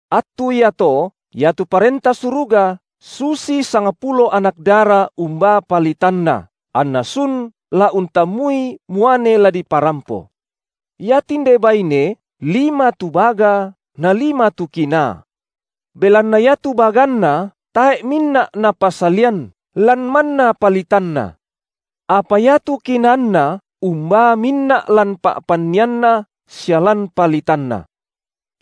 Attu iato iatu Parenta Suruga susi sangpulo anak dara umbaa palitanna, anna sun la untammui muane la diparampo. Ia tinde baine, lima tu baga, na lima tu kinaa. Belanna iatu baganna tae’ minna’ napasalian, lan manna palitanna. Apa iatu kinaanna umbaa minna’ lan pa’pannianna sia lan palitanna.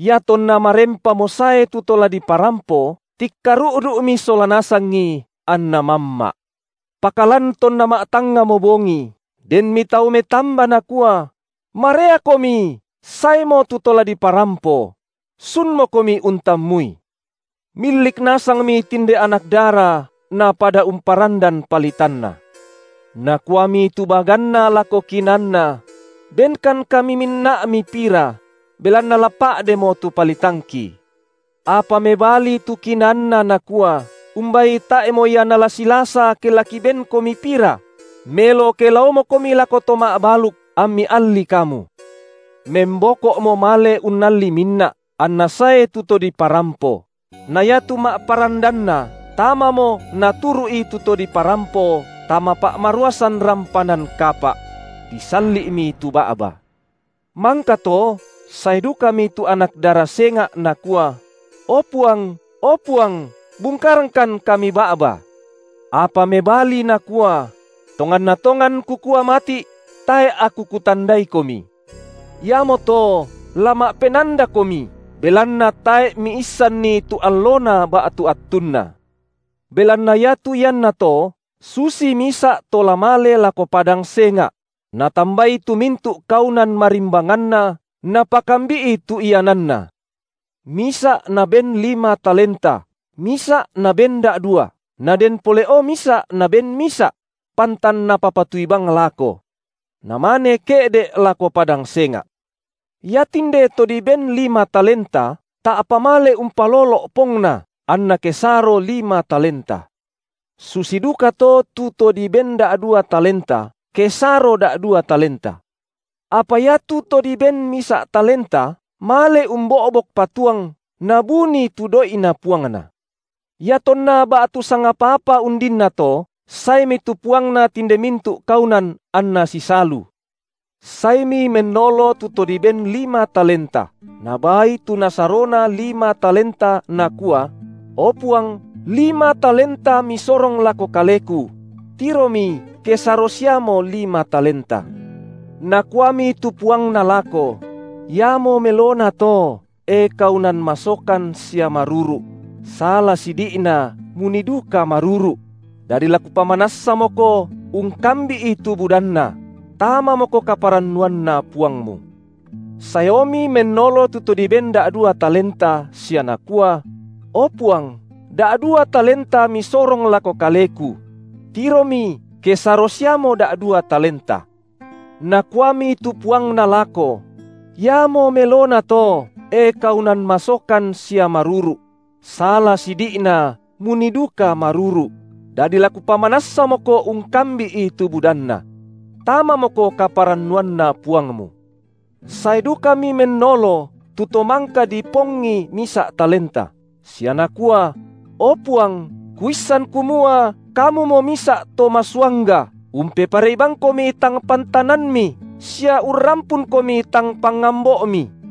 Iatonna marempamo sae tu to la diparampo tikkaru’du’mi sola nasangi, anna mamma’. Pakalan tonna ma’tangngamo bongi, denmi tau metamba nakua: Mareakomi saemo tu to la diparampo! Sunmokomi untammui! Millik nasangmi tinde anak dara napada umparandan palitanna. Nakuami tu baganna lako kinaanna: Benkan kami minna’mi pira, belanna la pa’demo tu palitangki. Apa mebali tu kinaanna nakua: Umbai tae’mo ia nala silasa ke la kibenkomi pira; melo ke laomokomi lako to ma’baluk, ammi allii kamu. Memboko’mo male unnalli minna’, anna sae tu to diparampo; na iatu ma’parandanna tamamo naturu’i tu to diparampo tama pa’maruasan rampanan kapa’; disalli’mi tu ba’ba. Mangkato sae dukami tu anak dara senga’ nakua: O puang, o puang, bungkarangkan kami ba’ba. Apa mebali nakua: Tonganna tongan kukua mati’: tae’ aku kutandai- komi. Iamoto la ma’penandakomi, belan- na tae’ miissanni tu allona ba’tu attunna. Belanna iatu iannato susi misa’ to la male lako padang senga’; natambai tu mintu’ kaunan marimbanganna, napakambi’i tu iananna. Misa’ naben lima talenta, misa’ naben da’dua, naden pole’o misa’ naben misa’; pantan napapatui bang lako. Namane ke’de’ lako padang senga’. Iatinde to diben lima talenta, ta’pa male umpalolo’ pongna, anna kesaro lima talenta. Susi dukato tu to diben da’dua talenta, kesaro da’dua talenta. Apa iatu to diben misa’ talenta, male umbo’bok patuang, nabunii tu doi’na puangna. Iatonna ba’tu sangapa-apa undinnato, saemi tu puangna tinde mintu’ kaunan anna sisalu. Saemi mennolo tu to diben lima talenta, nabaai tu nasarona lima talenta, nakua: O Puang, lima talenta misorong lako kaleku; tiromi kesaro siamo lima talenta. Nakuami tu puangna lako: iamo melonato, e kaunan masokan sia maruru’! sala sidi’na munii duka maruru’; dadi la kupamanassamoko ungkambi’i tu budanna: tamamoko kaparannuanna puangmu. Saeomi mennolo tu to diben da’dua talenta, sia nakua: O puang, da’dua talenta misorong lako kaleku; tiromi kesaro siaomo da’dua talenta. Nakuami tu puangna lako: Iamo melonato, e kaunan masokan sia maruru’! sala sidi’na munii duka maruru’; dadi la kupamanassamoko ungkambi’i tu budanna. Tamamoko kaparannuanna puangmu. Sae dukami mennolo tu to mangka dipongi misa’ talenta, sia nakua: O puang, kuissan kumua kamumo misa’ to masuangga, umpeparei bangkomi tangpantananmi, sia urrampunkomi tang pangambo’mi;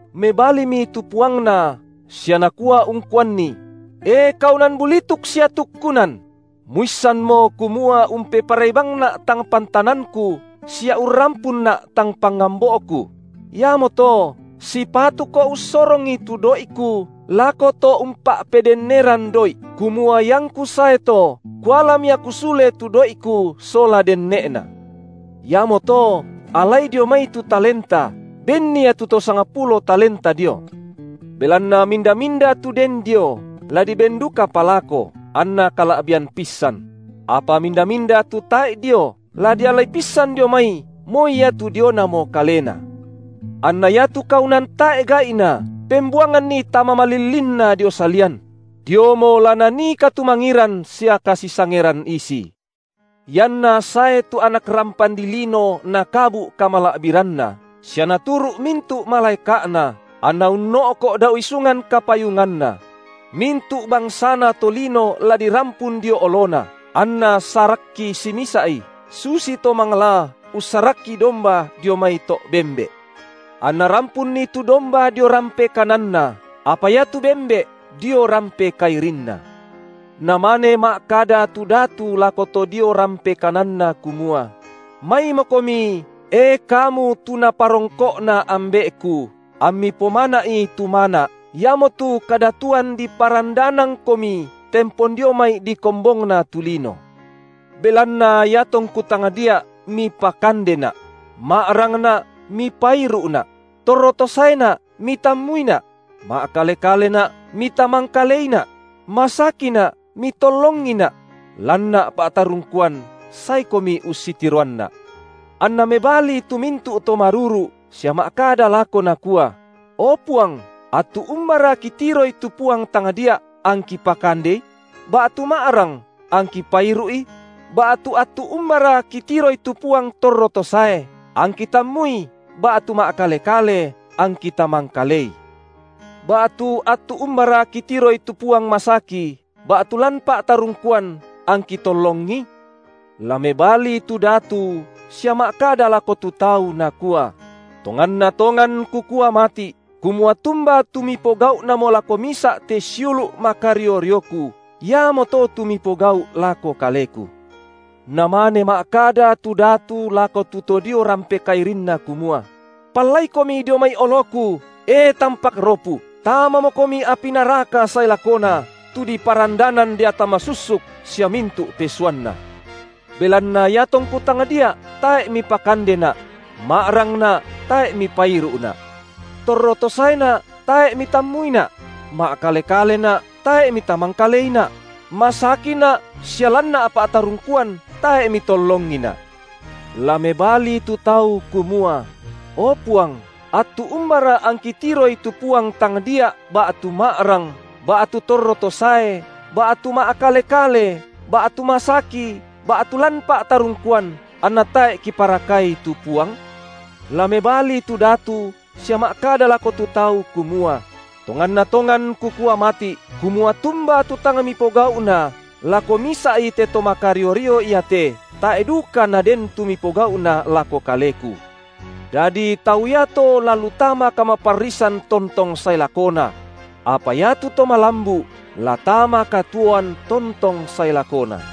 Mebalimi tu puangna, sia nakua ungkuanni: E kaunan bulituk sia tukkunan! muissanmo kumua umpeparei bangna’ tang pantananku sia urrampunna’ tang pangambo’ku; iamoto, sipatuko ussorongi tu doi’ku lako to umpa’pedenneran doi’, kumua iangku sae to kualami aku sule tu doi’ku sola denne’na. Iamoto allai dio mai tu talenta, benni ia tu to sangpulo talenta dio. Belanna minda-minda tu den dio, la diben dukapa lako, anna kala’bian pissan; apa minda-minda tu tae’ dio, la dialai pissan dio mai moi iatu dionamo kalena. Anna iatu kaunan tae’ gai’na pembuanganni tama malillinna dio salian; diomo la nanii katumangiran sia kasisangeran isi. IanNa sae tu Anak rampan dilino nakabu’ kamala’biranNa, sia naturu’ mintu’ malaeka’Na, anNa unno’ko’ dao isungan kapayunganNa; mintu’ bangsana tolino la dirampun dio oloNa, anNa sarakki simisa’i, susi to manglaa ussarakki domba dio mai to’ bembe’. Anna rampunni tu domba dio rampe kananNa, apa iatu bembe’ dio rampe kairinNa. Namane ma’kada tu Datu lako tu to dio rampe kananNa kumua: Maimokomi, e kamu tu Naparongko’na Ambe’Ku, ammi pomana’i tu mana’, iamotu kadatuan diparandanangkomi tempon dio mai dikombongna tu lino. Belanna iatongKu tangdia’, mipakandeNa’; ma’rangNa’ mipairu’Na’; torro to saeNa’, mitammuiNa’; ma’kale-kaleNa’, mitamangkaleiNa’; masakiNa’, mitollongiNa’; lanNa’ pa’tarungkuan, saekomi ussitiroanNa’. Anna mebali tu mintu’ to maruru’, sia ma’kada lako nakua: O Puang, attu umbara kitiroi tu Puang tangdia’, angki pakandeI? ba’tu ma’rang, angki pairu’I? Ba’tu attu umbara kitiroi tu Puang torro to sae, angki tammui ba’tu ma’kale-kale, angki tamangkalei. Ba’tu attu umbara kitiroI tu Puang masaki, ba’tu lan pa’tarungkuan, angki tollongI? La mebali tu Datu, sia ma’kada lako tu tau, Nakua: Tonganna tongan Kukua mati’, kumua tumba tu mipogau’namo lako misa’ te siulu’ makario-rioKu, iamoto tu mipogau’ lako Kaleku. Namane ma’kada tu Datu lako tu to dio rampe kairinNa kumua: Pallaikomi dio mai oloKu, e tampak ropu, tamamokomi api naraka sae lakona, tu diparandanan deata masussuk sia mintu’ pesuanna. Belanna iatongKu tangdia’ tae’ mipakandeNa’; ma’rangNa’, tae’ Mipairu’Na’; torro to saeNa’, tae’ mitammuiNa’; ma’kale-kaleNa’, tae’ mitamangkaleiNa’; masakiNa’ sia lanNa’ pa’tarungkuan, tae’ mitollongiNa’; La mebali tu tau, kumua: O Puang, attu umbara angki tiroI tu Puang tangdia’ ba’tu ma’rang, ba’tu torro to sae, ba’tu ma’kale-kale, ba’tu masaki, ba’tu lan pa’tarungkuan, anna tae’ kiparakai tu Puang? La mebali tu Datu, sia ma’kada lako tu tau kumua: Tonganna tongan Kukua mati’, kumua tumba tu tang mipogau’na lako misa’i te to makario-rio iate, tae’ duka naden tu mipogau’na lako Kaleku. Dadi tau iato la lu tama kamaparrisan tontong sae lakona; apa iatu to malambu’ la tama katuoan tontong sae lakona.